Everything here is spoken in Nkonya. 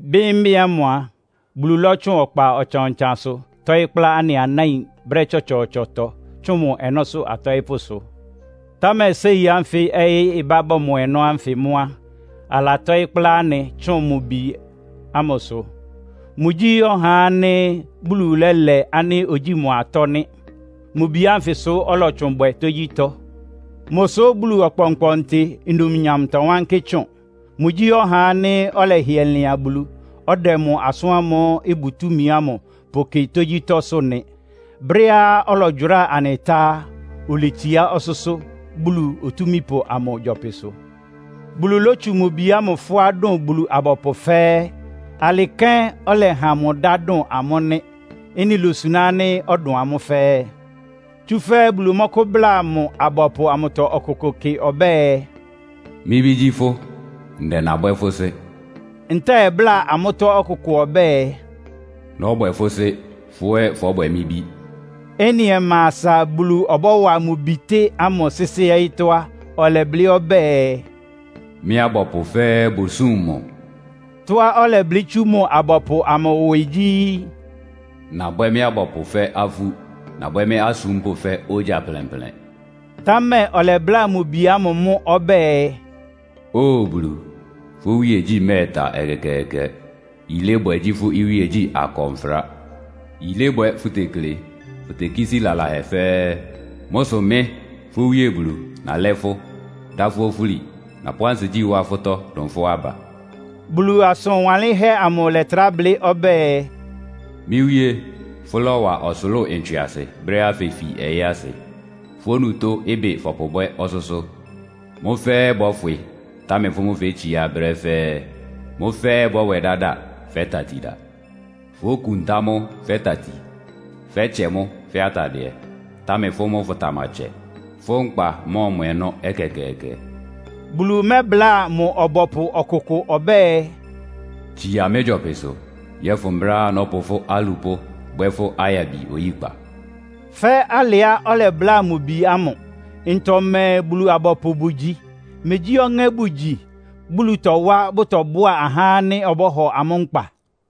Bɩ́mbɩ́ ámʋ a, Bulu lɔ́tsʋn ɔkpa ɔtsan-ɔtsansʋ tɔ́ɩ́ kplá anɩ anáin brɛ́ tsɔtsɔɔtsɔtɔ tsʋn mʋ ɔnɔ́sʋ́ atɔɩ́pʋ́sʋ. Támɛ séi ánfɩ ɔyɩ́ ɩbá bɔmɔ ɔnɔ́ ánfɩ mʋ́ á, alatɔ́ɩ́ kplá anɩ tsʋn mʋ Bi ámʋsʋ. Mʋgyí ɔhá ánɩ́ Bulu lɛ́lɛ ánɩ́ ógyi mʋ atɔ́ nɩ́. Mʋ Bi ánfɩsʋ ɔlɔtsʋn bwɛ tógyítɔ́. Mʋsʋ Bulu Ɔkpɔnkpɔntɩ numnyam tɔwánkɩ́ tsʋn. Mʋgyí ɔhá ánɩ́ ɔlɛhɩɛ lɩan Bulu, ɔdɛ mʋ asʋ́n ámʋ́ʋ́ ɩbʋ túmi ámʋ pʋkɩ tógyítɔ́sʋ́ nɩ. Brɛ́á ɔlɔgyʋráa anɩ tá á, oletsiá ɔsʋ́sʋ́ Bulu Otúmípʋ amʋ gyɔpɩsʋ. Bulu lótsu mʋ Bi ámʋ fʋ́á dʋn Bulu-abɔpʋ fɛ́ɛ́. Alɩ kɛ́n ɔlɛha mʋ dá dʋn amʋ́ nɩ́. Ɩ́nɩ lósuná ánɩ́ ɔdʋn amʋ́ fɛ́ɛ́. Tsúfɛ́ Bulu mɔ́kʋ́bláa mʋ abɔpʋ amʋtɔ ɔkʋkʋʋkʋ kɩ ɔbɛ́ɛ, “Mɩ́ Bí gyí fʋ́, ndɛ nabwɛ́ fʋ́ Sɩ́.” Ntɛ́ɛ bláa amʋ́tɔ́ ɔkʋkʋ ɔbɛ́ɛ, “Nɔ́bwɛ fʋ́ Sɩ́, fʋ́ ɛ́ fɔ́bwɛ mɩ́ Bí.” Ɩ́nɩ ɔma asa Bulu ɔbɔ́wa mʋ Bitɩ́ ámʋ sɩ́sɩ́ ɔyɩ́tɔ́ á, ɔlɛblɩ́ ɔbɛ́ɛ, “Mɩ́ abɔpʋ fɛ́ɛ́ bʋsúm mʋ.” Tɔ́á ɔlɛblɩ́ tsú mʋ abɔpʋ amʋ mʋ́ ɩwɩ gyí, “Nabwɛ́ mɩ́ abɔpʋ fɛ́ afú. Nabwɛ́ mɩ́ asúmpʋ́ fɛ́ ogya plɛnplɛn.” Támɛ ɔlɛbláa mʋ Bi ámʋ mʋ́ ɔbɛ́ɛ, “Óo Bulu, fʋ́ iwíegyí mɛ́ɛta ɛkɛkɛɛkɛ! Yilébwɛ gyí fʋ́ iwíegyí akɔnfra. Yilébwɛ fʋtekle. Fʋtekísí lalahɛ fɛ́ɛ́. Mʋ́ sʋ mɩ́, fʋ́ Wíe Bulu nalɛ́ fʋ́, dá fʋ́ ofúli. Napʋ́ ansigyí wá fʋ́tɔ́ dʋn fʋ́ aba.” Bulu asʋn wanlɩ́nhɛ́ amʋ lɛ́trá blɩ́ ɔbɛ́ɛ, “Mɩ́ Wíé, fʋ́lɔ́wa ɔsʋlʋ́ʋ ntswɩasɩ brɛ́á fefi ɔyɩ́ asɩ. Fʋ́ onutó ɩbɩ fɔpʋbwɛ́ ɔsʋ́sʋ́. Mʋ́ fɛ́ɛ́ bɔ́fwɩ, támɛ fʋ́ mʋ́ fétsiá brɛ́ fɛ́ɛ́. Mʋ́ fɛ́ɛ́ bɔ́bwɛ dáda fɛ́ tatida. Fókuntá mʋ́ fɛ́ tati. Fɛ́tsɛ mʋ́ fɛ́ atadɩɛ. Támɛ fʋ́ mʋ́ fʋtamatsɛ. Fʋ́ nkpa mɔ́ɔmɔ ɔnɔ́ ɛkɛkɛɛkɛ.” Bulu mɛ́bláa mʋ ɔbɔpʋ ɔkʋkʋ ɔbɛ́ɛ, “Tsia mɩ́ gyɔpɩsʋ, yɔ́fʋn brɛ́á nɔ́pʋ fʋ́ alupʋ́ bwɛ́ fʋ́ ayabi oyíkpa.” fɛ́ alɩá ɔlɛbláa mʋ Bi ámʋ. Ntɔ mɛɛ Bulu-abɔpʋ bʋgyi? Megyí ɔŋɛ́ bʋgyi, Bulu tɔwá bʋtɔbʋ́a ahá ánɩ́ ɔbɔ́hɔ amʋ́ nkpa?